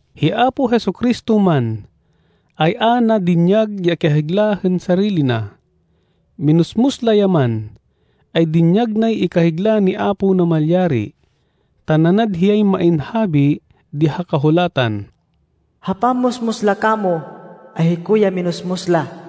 Hi Apo Jesu-Cristo man, ay a na dinyag ya ikahigla hên sarili na. Minusmus la ya man, ay dinyag nay ikahigla ni Apo Namalyari. Ta nanad hiyay main habi di ha Kahulatan, “Ha pammusmus la kamo, ay hiko ya minusmus la.”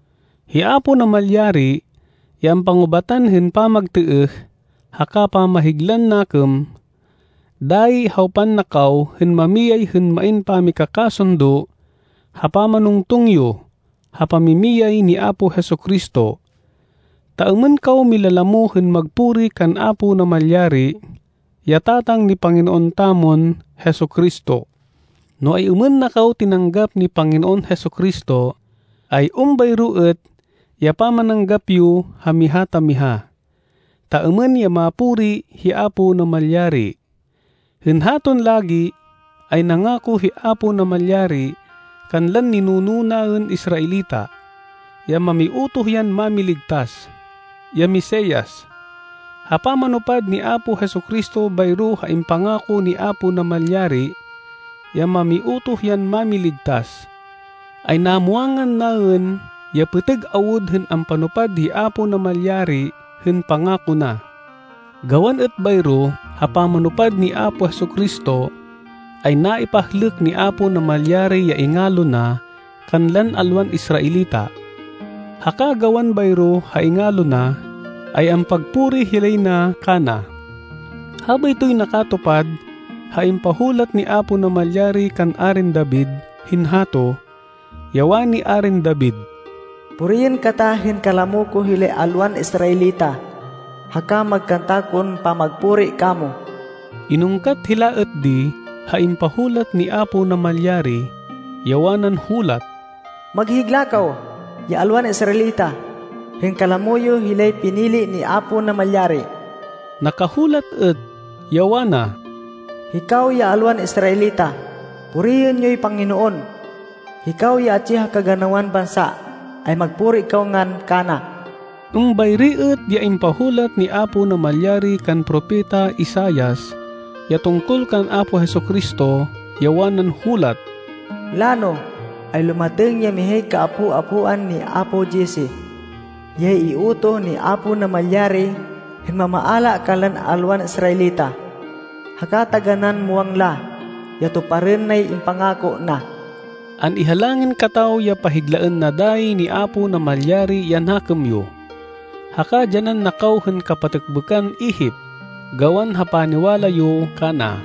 Hi Apo Namalyari ya ampangubatan hên pamagtêêh haka pamahiglan nakêm. Dayi hawpan na kaw hên mamiyay hên main pamikakasundo ha pamanungtung yo ha pamimiyay ni Apo Jesu-Cristo, ta êmên kaw milalamo hên magpuri kan Apo Namalyari, ya Tatang ni Panginoon tamon Jesu-Cristo. No ay-êmên na kaw tinanggap ni Panginoon Jesu-Cristo, ay êmbayro êt ya pamananggap yo ha miha ta miha, ta êmên ya mapuri hi Apo Namalyari. Hên haton lagi, ay nangako hi Apo Namalyari kanlan ninuno naên Israelita, ya mamiutoh yan Mámiligtas, ya Mesias. Ha pamanupad ni Apo Jesu-Cristo bayro ha impangako ni Apo Namalyari, ya mamiutoh yan Mámiligtas, ay namwangan naên ya pêtêg awud hên ampanupad hi Apo Namalyari hên pangako na. Gawan êt bayro ha pamanupad ni Apo Jesu-Cristo, ay naipahlêk ni Apo Namalyari ya ingalo na kanlan alwan Israelita. Haka gawan bayro ha ingalo na, ay ampagpuri hilay na kana. Habaytoy nakatupad ha impahulat ni Apo Namalyari kan Arin David hên hato, ya wani Arin David, “Puriên kata hên kalamo ko hilay alwan Israelita, haka magkanta kon pamagpuri kamo!” Inungkat hila êt di ha impahulat ni Apo Namalyari, ya wanan hulat, “Maghigla kaw, ya alwan Israelita hên kalamo yo hilay pinili ni Apo Namalyari!” Nakahulat êt, ya wana, “Hikaw ya alwan Israelita, puriên yoy Panginoon! Hikaw ya atsi ha kaganawan bansa, ay magpuri kaw ngan kana!” Êmbayri êt ya impahulat ni Apo Namalyari kan Propeta Isaias, ya tungkol kan Apo Jesu-Cristo, ya wanan hulat, “Lano, ay lumatêng ya mihay kaapo-apoan ni apo Jesse. Hiyay iutoh ni Apo Namalyari hên mamaala kanlan alwan Israelita. Haka taganán muwang la, ya tuparên nay impangako na.” An-ihalangin kataw ya pahiglaên na dayi ni Apo Namalyari ya nakêm yo, haka dyanan na kaw hên kapatêkbêkan ihip gawan ha paniwala yo kana,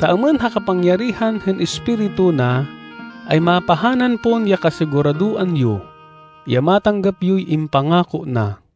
ta êmên ha kapangyarihan hên Espiritu na, ay mapahanan pon ya kasiguradoan yo, ya matanggap yoy impangako na.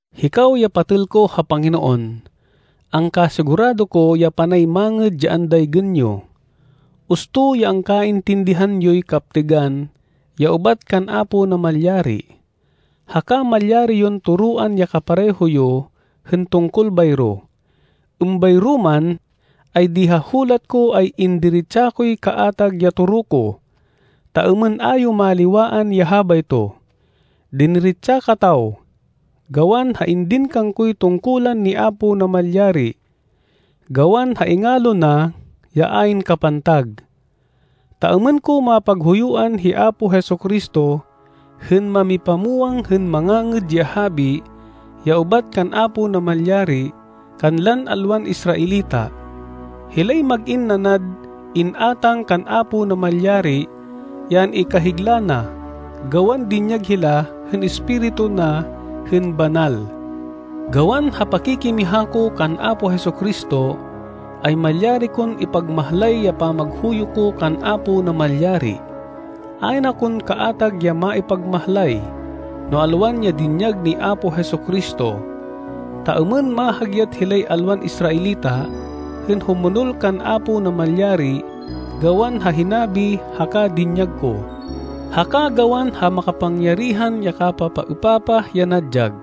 Hikaw ya patêl ko ha Panginoon, angkasigurado ko ya panay mangêd ya andaygên yo. Usto ya angkaintindihan yoy kaptêgan ya ubat kan Apo Namalyari, haka malyari yon toroan ya kapareho yo hên tungkol bayro. Êmbayro man, ay di ha hulat ko ay indiretsa koy kaatag ya toro ko, ta êmên a yo maliwaan ya habayto. Diniretsa kataw, gawan ha indin kangkoy tungkulan ni Apo Namalyari, gawan ha ingalo na ya ayn kapantag, ta êmên ko mapaghuyuan hi Apo Jesu-Cristo hên mamipamwang hên Mangangêd ya Habi ya ubat kan Apo Namalyari kanlan alwan Israelita. Hilay mag-in nanad in-átang kan Apo Namalyari ya an-ikahigla na, gawan dinyag hila hên Espiritu na hên banal. Gawan ha pakikimiha ko kan Apo Jesu-Cristo, ay malyari kon ipagmahlay ya pamaghuyo ko kan Apo Namalyari. Ayn akon kaatag ya maipagmahlay, no alwan ya dinyag ni Apo Jesu-Cristo, ta êmên mahagyat hilay alwan Israelita hên humonol kan Apo Namalyari gawan ha hinabi haka dinyag ko, haka gawan ha makapangyarihan ya kapapaêpapah ya nadyag,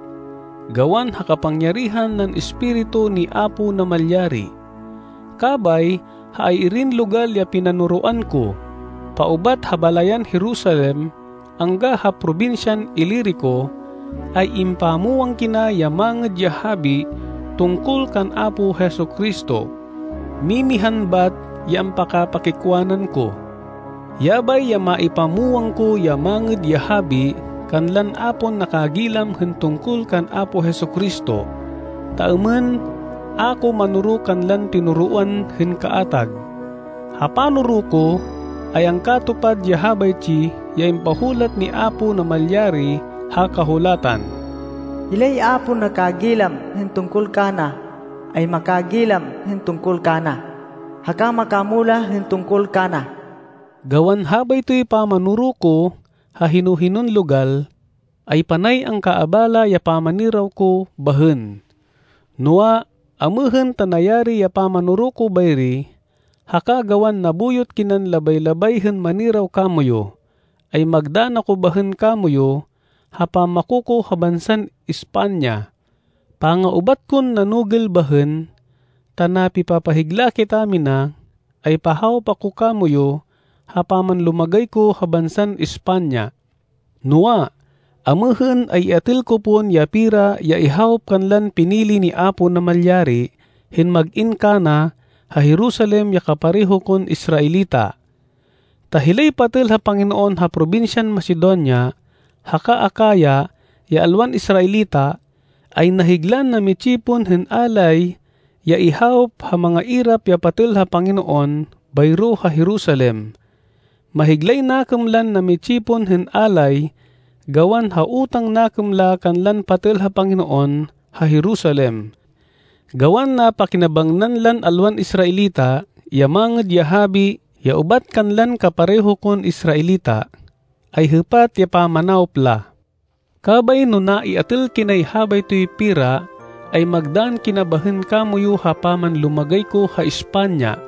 gawan ha kapangyarihan nan Espiritu ni Apo Namalyari. Kabay ha ay-irin logal ya pinanoroan ko, paubat ha balayan Jerusalem angga ha probinsyan Ilirico, ay impamwang kina ya Mangêd ya Habi tungkol kan Apo Jesu-Cristo. Mimihan bat ya ampakapakikwanan ko. Yabay ya maipamwang ko ya Mangêd ya Habi kanlan a pon nakagilam hên tungkol kan Apo Jesu-Cristo, ta êmên a ko manoro kanlan tinoroan hên kaatag. Ha panoro ko ay angkatupad ya habaytsi ya impahulat ni Apo Namalyari ha Kahulatan, “Hilay a pon nakagilam hên tungkol kana, ay makagilam hên tungkol kana, haka makamulah hên tungkol kana.” Gawan habaytoy pamanoro ko ha hino-hinon logal, ay panay angkaabala ya pamaniraw ko bahên. Noa, amêhên ta nayari ya pamanoro ko bayri, haka gawan nabuyot kinan labay-labay hên maniraw kamoyu, ay magdann ako bahên kamoyu ha pammako ko ha bansan España. Panga-ubat kon nanugêl bahên, ta napipapahigla kitamina, ay pahawop ako kamoyu ha pamanlumagay ko ha bansan España. Noa, amêhên, ay iatêl ko pon ya pera ya ihawop kanlan pinili ni Apo Namalyari hên mag-in kana ha Jerusalem ya kapareho kon Israelita, ta hilay patêl ha Panginoon ha probinsyan Macedonia haka Acaya ya alwan Israelita, ay nahiglan nami-tsipon hên alay ya ihawop ha mangairap ya patêl ha Panginoon bayro ha Jerusalem. Mahiglay nakêm lan nami-tsipon hên alay gawan ha utang nakêm la kanlan patêl ha Panginoon ha Jerusalem. Gawan napakinabangnan lan alwan Israelita ya Mangêd ya Habi ya ubat kanlan kapareho kon Israelita, ay hêpat ya pamanawop la. Kabay no naiatêl kinay habaytoy pera, ay magdann kina bahên kamoyu ha pamanlumagay ko ha España.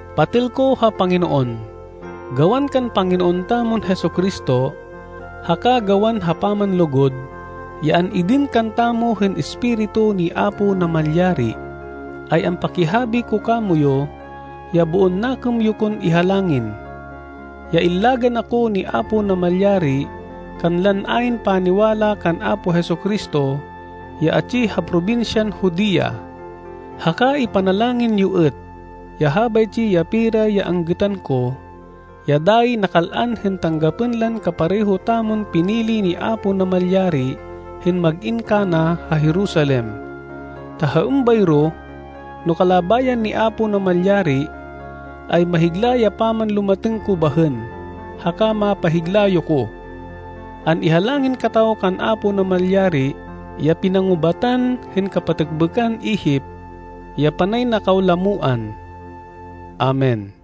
Patêl ko ha Panginoon, gawan kan Panginoon tamon Jesu-Cristo, haka gawan ha pamanlugud, ya an-indin kantamo hên Espiritu ni Apo Namalyari, ay ampakihabi ko kamoyu ya boon nakêm yo kon ihalangin, ya illagan ako ni Apo Namalyari kanlan ayn paniwala kan Apo Jesu-Cristo ya atsi ha probinsyan Judea. Haka ipanalangin yo êt ya habaytsi ya pera ya anggêtan ko, ya dayi nakal-an hên tanggapên lan kapareho tamon pinili ni Apo Namalyari hên mag-in kana ha Jerusalem, ta ha êmbayro, no kalabayan ni Apo Namalyari, ay mahigla ya pamanlumatêng ko bahên, haka mapahigla yo ko. An-ihalangin kataw kan Apo Namalyari ya pinangubatan hên kapatêkbêkan ihip, ya panay na kaw lamoan. Amen.